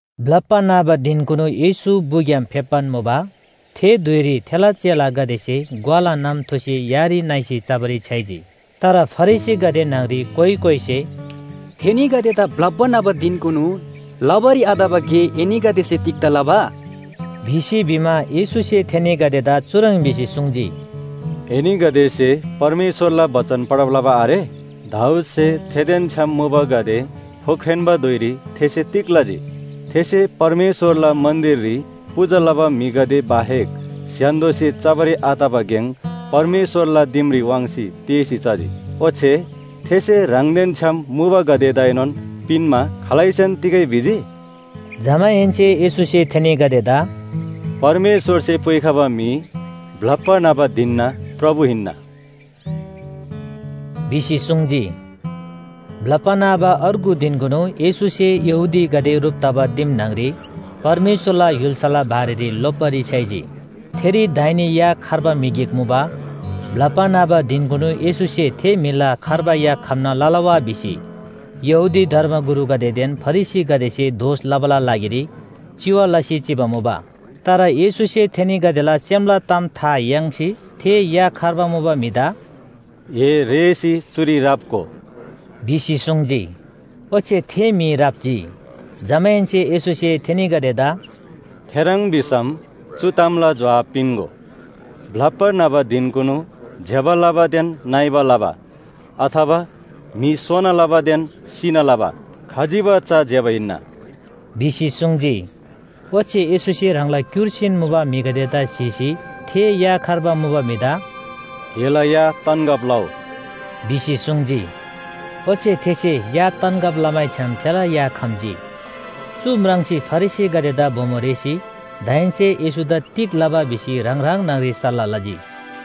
ब्‍लप्‍बा न्‍हबा धिनकुनु येशू बुग्‍याम फेप्‍बान मुबा। थे धुइरी थेला चेलागदेसे ग्‍वाला नम थुसी यारी न्‍हइसी चबारी छ्‌याइजी। तर फरिसीगदे न्‍हङरी कोइ कोइसे “थेनीगदेदा ब्‍लप्‍बा न्‍हबा धिनकुनु लबारी आतबा गे एनीगदेसे तिग्‍दा लबा?” भिसी भिमा, येशूसे थेनीगदेदा चुह्रङ् भिसी सुङ्जी, “एनीगदेसे परमेश्‍वरला बचन पढब लबा आरे? दाऊदसे थेदेन छ्‌याम मुबागदे फोख्रेन्‍बा धुइरी थेसे तिग लजी? थेसे परमेश्‍वरला मन्‍दिररी पूजा लबा म्‍हिगदे बाहेक स्‍य्‍हान्‍दोसे चबारी आतबा गेङ परमेश्‍वरला दिमरी वाङ्सी तेःसी चजी। ओच्‍छे थेसे ह्राङदेन छ्‌याम मुबागदेदाएनोन पिन्‍मा खालैसेन तिगै भिजी?” जमाहेन्‍से येशूसे थेनीगदेदा “परमेश्‍वरसे पुइखबा म्‍हि ब्‍लप्‍बा न्‍हबा धिनना प्रभु हिन्‍ना” भिसी सुङ्जी। ब्‍लप्‍बा न्‍हबा अर्गु धिनकुनु येशूसे यहूदीगदे ह्रुप तबा दिम न्‍हङरी परमेश्‍वरला य्‍हुल्‍साला बारेरी लोप्‍बारी छ्‌याइजी। थेरी दाहिने या खर्बा म्‍हि गिक मुबा। ब्‍लप्‍बा न्‍हबा धिनकुनु येशूसे थे म्‍हिला खर्बा या खम्‍ना लला वा भिसी यहूदी धर्मगुरुगदेदेन फरिसीगदेसे दोष लबाला लागिरी चिवा लसी चिबा मुबा। तर येशूसे थेनीगदेला सेमला ताम था याङ्सी थे या खर्बा मुबा म्‍हिदा “ए रेःसी चुरी राप्‍गो” भिसी सुङ्जी। ओच्‍छे थे म्‍हि राप्‍जी। जमाहेन्‍से येशूसे थेनीगदेदा “थेह्रङ् भिसम चु तामला जोहाब पिन्‍गो, ब्‍लप्‍बा न्‍हबा धिनकुनु ज्‍यबा लबादेन नइबा लबा, अथवा म्‍हि सोना लबादेन सिना लबा खजिबा चा ज्‍यबा हिन्‍ना” भिसी सुङ्जी। ओच्‍छे येशूसे ह्राङला क्‍युर्सीन मुबा म्‍हिगदेदा स्‍हीसी थे या खर्बा मुबा म्‍हिदा “एला या तन्‍गब लउ!” भिसी सुङ्जी। ओच्‍छे थेसे या तन्‍गब लमैछ्‌याम थेला या खम्‍जी। चु म्राङ्सी फरिसीगदेदा बोमो रेःसी दाहेन्‍से येशूदा तिग लबा भिसी ह्राङ ह्राङ न्‍हङरी सल्‍लाह लजी।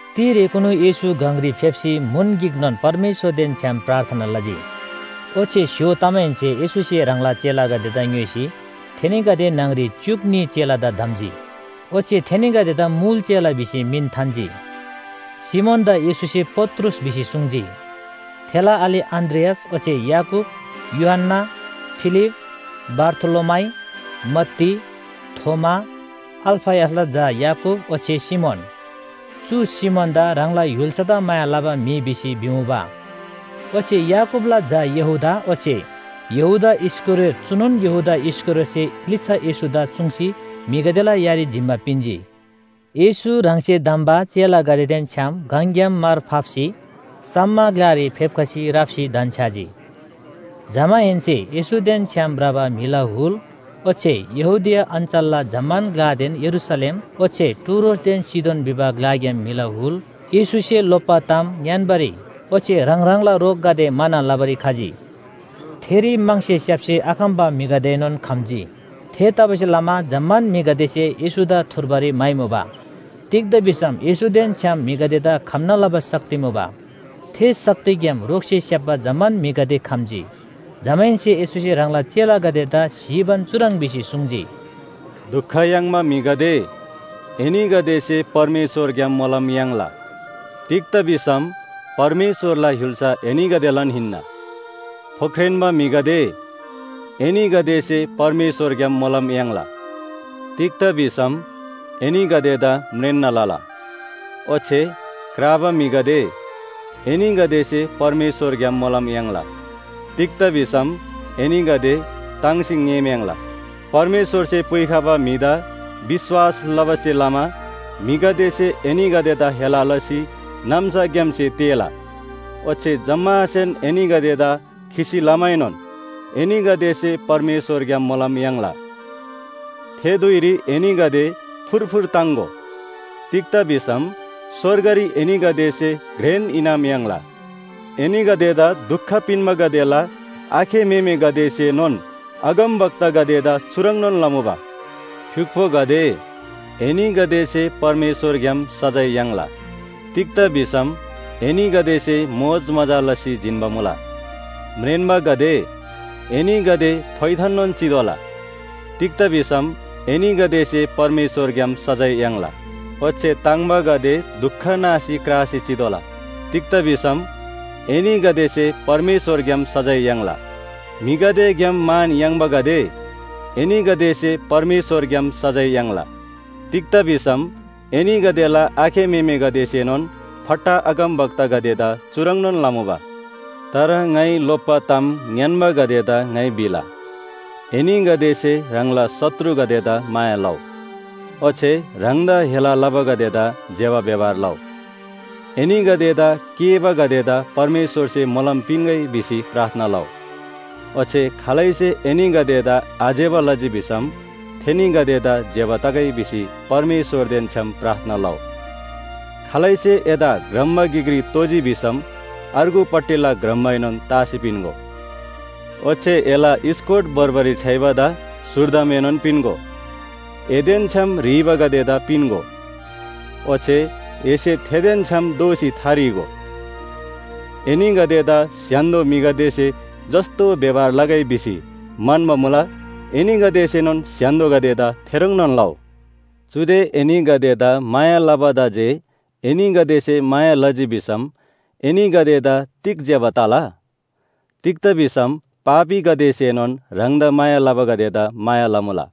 तिरेकुनु येशू गङरी फेप्‍सी म्‍हुन गिकनोन परमेश्‍वरदेन छ्‌याम प्रार्थना लजी। ओच्‍छे स्‍य्‍हो तमाहेन्‍से येशूसे ह्राङला चेलागदेदा ङ्‌योइसी थेनीगदे न्‍हङरी च्‍युक न्‍ही चेलादा धम्‍जी। ओच्‍छे थेनीगदेदा मुल चेला भिसी मिन थान्‍जी। सिमोनदा येशूसे पत्रुस भिसी सुङ्जी, थेला आले अन्‍द्रियास ओच्‍छे याकूब, यूहन्‍ना, फिलिप, बारथोलोमाइ, मत्ती, थोमा, अल्‍फयसला झा याकूब ओच्‍छे सिमोन। चु सिमोनदा ह्राङला य्‍हुल्‍सादा माया लबा म्‍हि भिसी भिमुबा। ओच्‍छे याकूबला झा यहूदा, ओच्‍छे यहूदा इस्‍करियोत चुनोन यहूदा इस्‍करियोतसे लिच्‍छा येशूदा चुङ्सी म्‍हिगदेला यारी जिम्‍मा पिन्‍जी। येशू ह्राङसे धम्‍बा चेलागदेदेन छ्‌याम गङग्‍याम मार फाप्‍सी सम्‍म ग्‍लारी फेप्‍खसी राप्‍सी धन्‍छ्‌याजी। जमाहेन्‍से येशूदेन छ्‌याम भ्रबा म्‍हिला हुल ओच्‍छे यहूदिया अञ्‍चलला जम्‍मान ग्‍लादेन यरूशलेम, ओच्‍छे टुरोसदेन सीदोन भिबा ग्‍लाग्‍याम म्‍हिला हुल येशूसे लोप्‍बा ताम ङ्‌यान्‍बारी ओच्‍छे ह्राङ ह्राङला रोगगदे म्‍हाना लबारी खजी। थेरी म्‍हङसे स्‍याप्‍सी आखम्‍बा म्‍हिगदेएनोन खम्‍जी। थेतबासेलमा जम्‍मान म्‍हिगदेसे येशूदा थुर्बारी म्‍हाइमुबा। तिग्‍दा भिसम येशूदेन छ्‌याम म्‍हिगदेदा खम्‍ना लबा शक्ति मुबा। थे शक्तिग्‍याम रोगसे स्‍याप्‍बा जम्‍मान म्‍हिगदे खम्‍जी। जमाहेन्‍से येशूसे ह्राङला चेलागदेदा स्‍हीबान चुह्रङ् भिसी सुङ्जी, “दुख याङ्बा म्‍हिगदे, एनीगदेसे परमेश्‍वरग्‍याम मोलम याङ्ला। तिग्‍दा भिसम परमेश्‍वरला य्‍हुल्‍सा एनीगदेलान हिन्‍ना। फोख्रेन्‍बा म्‍हिगदे, एनीगदेसे परमेश्‍वरग्‍याम मोलम याङ्ला। तिग्‍दा भिसम एनीगदेदा परमेश्‍वरसे म्रेन्‍ना लला। ओच्‍छे क्राबा म्‍हिगदे, एनीगदेसे परमेश्‍वरग्‍याम मोलम याङ्ला। तिग्‍दा भिसम परमेश्‍वरसे एनीगदे ताङ्सी ङेःम्‍याङ्‍ला। “परमेश्‍वरसे पुइखबा म्‍हिदा विश्‍वास लबासे लमा म्‍हिगदेसे एनीगदेदा हेला लसी नाम्‍साग्‍यामसे तेःला ओच्‍छे जम्‍मासेन एनीगदेदा खिसी लमाएनोन एनीगदेसे परमेश्‍वरग्‍याम मोलम याङ्ला। “थे धुइरी एनीगदे फुरफुर ताङ्‍गो। तिग्‍दा भिसम स्‍वर्गरी एनीगदेसे घ्रेन इनाम याङ्ला। एनीगदेदा दुख पिन्‍बागदेला आखे म्‍हेमेगदेसेनोन अगमवक्तागदेदा चुह्रङ्‌नोन लमुबा। फ्‍युक्‍पोगदे, एनीगदेसे परमेश्‍वरग्‍याम सजाय याङ्ला। तिग्‍दा भिसम एनीगदेसे मोजमजा लसी जिन्‍बा मुला। म्रेन्‍बागदे, एनीगदे फोइथाननोन चितोःला। तिग्‍दा भिसम एनीगदेसे परमेश्‍वरग्‍याम सजाय याङ्ला। ओच्‍छे ताङ्बागदे दुख नासी क्रासी चितोःला। तिग्‍दा भिसम एनीगदेसे परमेश्‍वरग्‍याम सजाय याङ्ला। म्‍हिगदेग्‍याम मान याङ्बागदे, एनीगदेसे परमेश्‍वरग्‍याम सजाय याङ्ला। तिग्‍दा भिसम एनीगदेला आखे म्‍हेमेगदेसेनोन फट्टा अगमवक्तागदेदा चुह्रङ्‌नोन लमुबा। “तर ङाइ लोप्‍बा ताम ङ्‌यान्‍बागदेदा ङाइ भिला, एनीगदेसे ह्राङला शत्रुगदेदा माया लउ, ओच्‍छे ह्राङदा हेला लबागदेदा ज्‍यबा व्‍यवहार लउ। एनीगदेदा केःबागदेदा परमेश्‍वरसे मोलम पिन्‍गै भिसी प्रार्थना लउ। ओच्‍छे खालैसे एनीगदेदा आज्‍यबा लजी भिसम थेनीगदेदा ज्‍यबा तगै भिसी परमेश्‍वरदेन छ्‌याम प्रार्थना लउ। खालैसे एदा ग्रम्‍बा गिकरी तोजी भसम अर्गुपट्टिला ग्रम्‍बाएनोन तासी पिन्‍गो। ओच्‍छे एला स्‍कोट भोर्बारी छ्‌याइबादा स्‍हुर्दमदाएनोन पिन्‍गो। एदेन छ्‌याम ह्रीबागदेदा पिन्‍गो, ओच्‍छे एसे थेदेन छ्‌याम दोःसी थाह्रीगो। एनीगदेदा स्‍य्‍हान्‍दो म्‍हिगदेसे जस्‍तो व्‍यवहार लगै भिसी म्‍हन्‍बा मुला, एनीगदेसेनोन स्‍य्‍हान्‍दोगदेदा थेह्रङ्नोन लउ। “चुदे एनीगदेदा माया लबादा जे एनीगदेसे माया लजी भिसम एनीगदेदा तिग ज्‍यबा तला? तिग्‍दा भिसम पापीगदेसेनोन ह्राङदा माया लबागदेदा माया लमुला।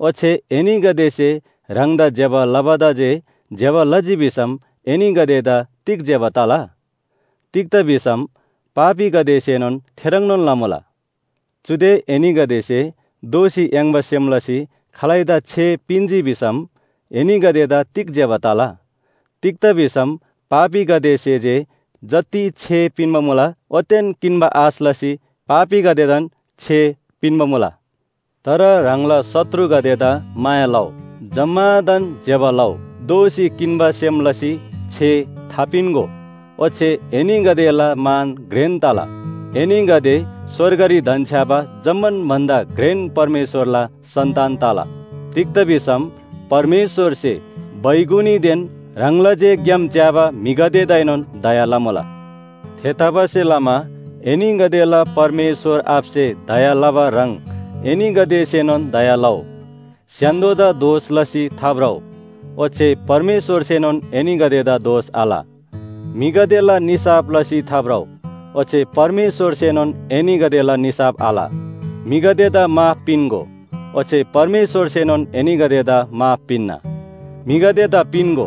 ओच्‍छे एनीगदेसे ह्राङदा ज्‍यबा लबादा जे ज्‍यबा लजी भिसम एनीगदेदा तिग ज्‍यबा तला? तिग्‍दा भिसम पापीगदेसेनोन थेह्रङ्नोन लमुला। चुदे एनीगदेसे दोःसी याङ्बा सेम लसी खालैदा छे पिन्‍जी भिसम एनीगदेदा तिग ज्‍यबा तला? तिग्‍दा भिसम पापीगदेसे जे जति छे पिन्‍बा मुला ओतेन किन्‍बा आश लसी पापीगदेदान छे पिन्‍बा मुला। तर ह्राङला शत्रुगदेदा माया लउ, जम्‍मादान ज्‍यबा लउ, दोःसी किन्‍बा सेम लसी छे थापिन्‍गो ओच्‍छे एनीगदेला मान घ्रेन तला। एनीगदे स्‍वर्गरी धन्‍छ्‌याबा जम्‍मान भन्‍दा घ्रेन परमेश्‍वरला सन्‍तान तला। तिग्‍दा भिसम परमेश्‍वरसे बैगुनीदेन ह्राङला जे ग्‍याम च्‍याबा म्‍हिगदेदाएनोन दया लमुला। थेतबासेलमा एनीगदेला परमेश्‍वर आबासे दया लबा ह्रङ् एनीगदेसेनोन दया लउ। “स्‍य्‍हान्‍दोदा दोष लसी थाभ्रउ ओच्‍छे परमेश्‍वरसेनोन एनीगदेदा दोष आल। म्‍हिगदेला निसाफ लसी थाभ्रउ ओच्‍छे परमेश्‍वरसेनोन एनीगदेला निसाफ आल। म्‍हिगदेदा माफ पिन्‍गो ओच्‍छे परमेश्‍वरसेनोन एनीगदेदा माफ पिन्‍ना। म्‍हिगदेदा पिन्‍गो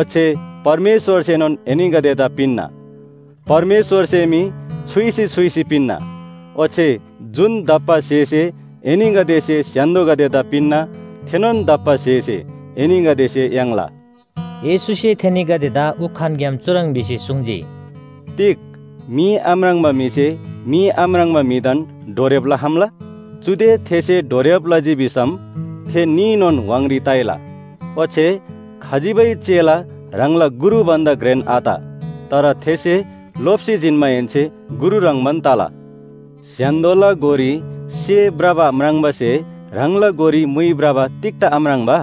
ओच्‍छे परमेश्‍वरसेनोन एनीगदेदा पिन्‍ना। परमेश्‍वरसे मी छुइसी छुइसी पिन्‍ना ओच्‍छे जुन दप्‍बा स्‍हेसे एनीगदेसे स्‍य्‍हान्‍दोगदेदा पिन्‍ना, थेनोन दप्‍बा स्‍हेसे एनीगदेसे याङ्ला।” येशूसे थेनीगदेदा उखानग्‍याम चुह्रङ् भिसी सुङ्जी, “तिग मी आम्राङ्बा म्‍हिसे मी आम्राङ्बा म्‍हिदान डोर्‍याब लखम्‍ला? चुदे थेसे डोर्‍याब लजी भिसम थे न्‍हीनोन व्‍हाङरी ताइला। ओच्‍छे खजिबै चेला ह्राङला गुरु भन्‍दा घ्रेन आत, तर थेसे लोप्‍सी जिन्‍माहेन्‍से गुरु ह्रङ्‌बान तला। “स्‍य्‍हान्‍दोला गोरी सेः भ्रबा म्राङ्बासे ह्राङला गोरी मुइ भ्रबा तिग्‍दा आम्राङ्बा?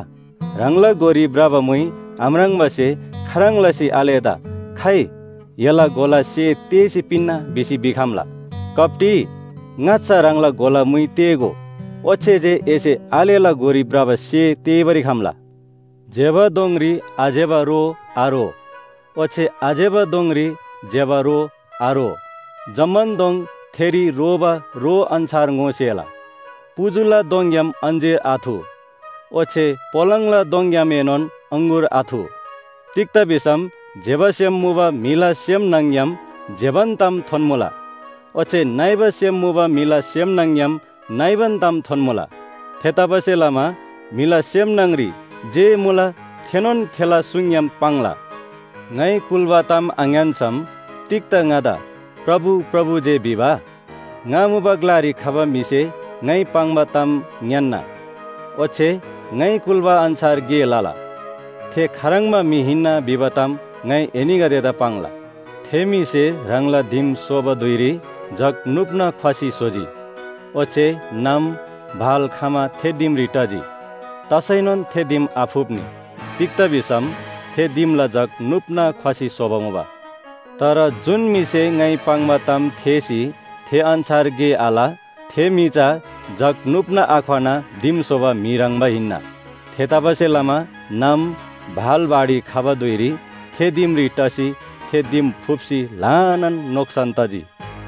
ह्राङला गोरी भ्रबा मुइ आम्राङ्बासे खाह्रङ् लसी आलेदा ‘खाइ, एला गोला सेः तेःसी पिन्‍ना भिसी भिखम्‍ला।’ कप्‍टी, ङाच्‍छा ह्राङला गोला मुइ तेःगो, ओच्‍छे जे एसे आलेला गोरी भ्रबा सेः तेःबारी खम्‍ला। “ज्‍यबा दोङरी आज्‍यबा रो आरो ओच्‍छे आज्‍यबा दोङरी ज्‍यबा रो आरो। जम्‍मान दोङ थेरी रोबा रो अन्‍छार ङोसेला। पुजुला दोङग्‍याम अञ्‍जीर आथु ओच्‍छे पोलाङला दोङग्‍यामएनोन अङगुर आथु। तिग्‍दा भिसम ज्‍यबा सेम मुबा म्‍हिला सेम न्‍हङ‍ग्‍याम ज्‍यबान ताम थोन्‍मुला ओच्‍छे नइबा सेम मुबा म्‍हिला सेम न्‍हङ‍ग्‍याम नइबान ताम थोन्‍मुला। थेतबासेलमा म्‍हिला सेम न्‍हङरी जे मुला थेनोन थेला सुङग्‍याम पाङ्ला। “ङाइ कुल्‍बा ताम आङ्‌यान्‍सम तिग्‍दा ङादा ‘प्रभु, प्रभु’ जे भिबा? ङा मुबा ग्‍लारी खबा म्‍हिसे ङाइ पाङ्बा ताम ङ्‌यान्‍ना ओच्‍छे ङाइ कुल्‍बा अन्‍छार गे लला। थे खाह्रङ्बा म्‍हि हिन्‍ना भिबा ताम ङाइ एनीगदेदा पाङ्ला। थे म्‍हिसे ह्राङला दिम स्‍होबा धुइरी जग नुप्‍ना ख्‍वसी स्‍होजी। ओच्‍छे नाम, भाल खमा थे दिमरी टजी। तसैनोन थे दिम आफुप्‍नी, तिग्‍दा भिसम थे दिमला जग नुप्‍ना ख्‍वसी स्‍होबा मुबा। तर जुन म्‍हिसे ङाइ पाङ्बा ताम थेःसी थे अन्‍छार गे आल थे म्‍हि चा जग नुप्‍ना आख्‍वना दिम स्‍होबा म्‍हि ह्रङ्‌बा हिन्‍ना। थेतबासेलमा नाम, भाल बाढी खबा धुइरी थे दिमरी टसी थे दिम फुप्‍सी ल्‍हानान नोक्‍सान तजी।”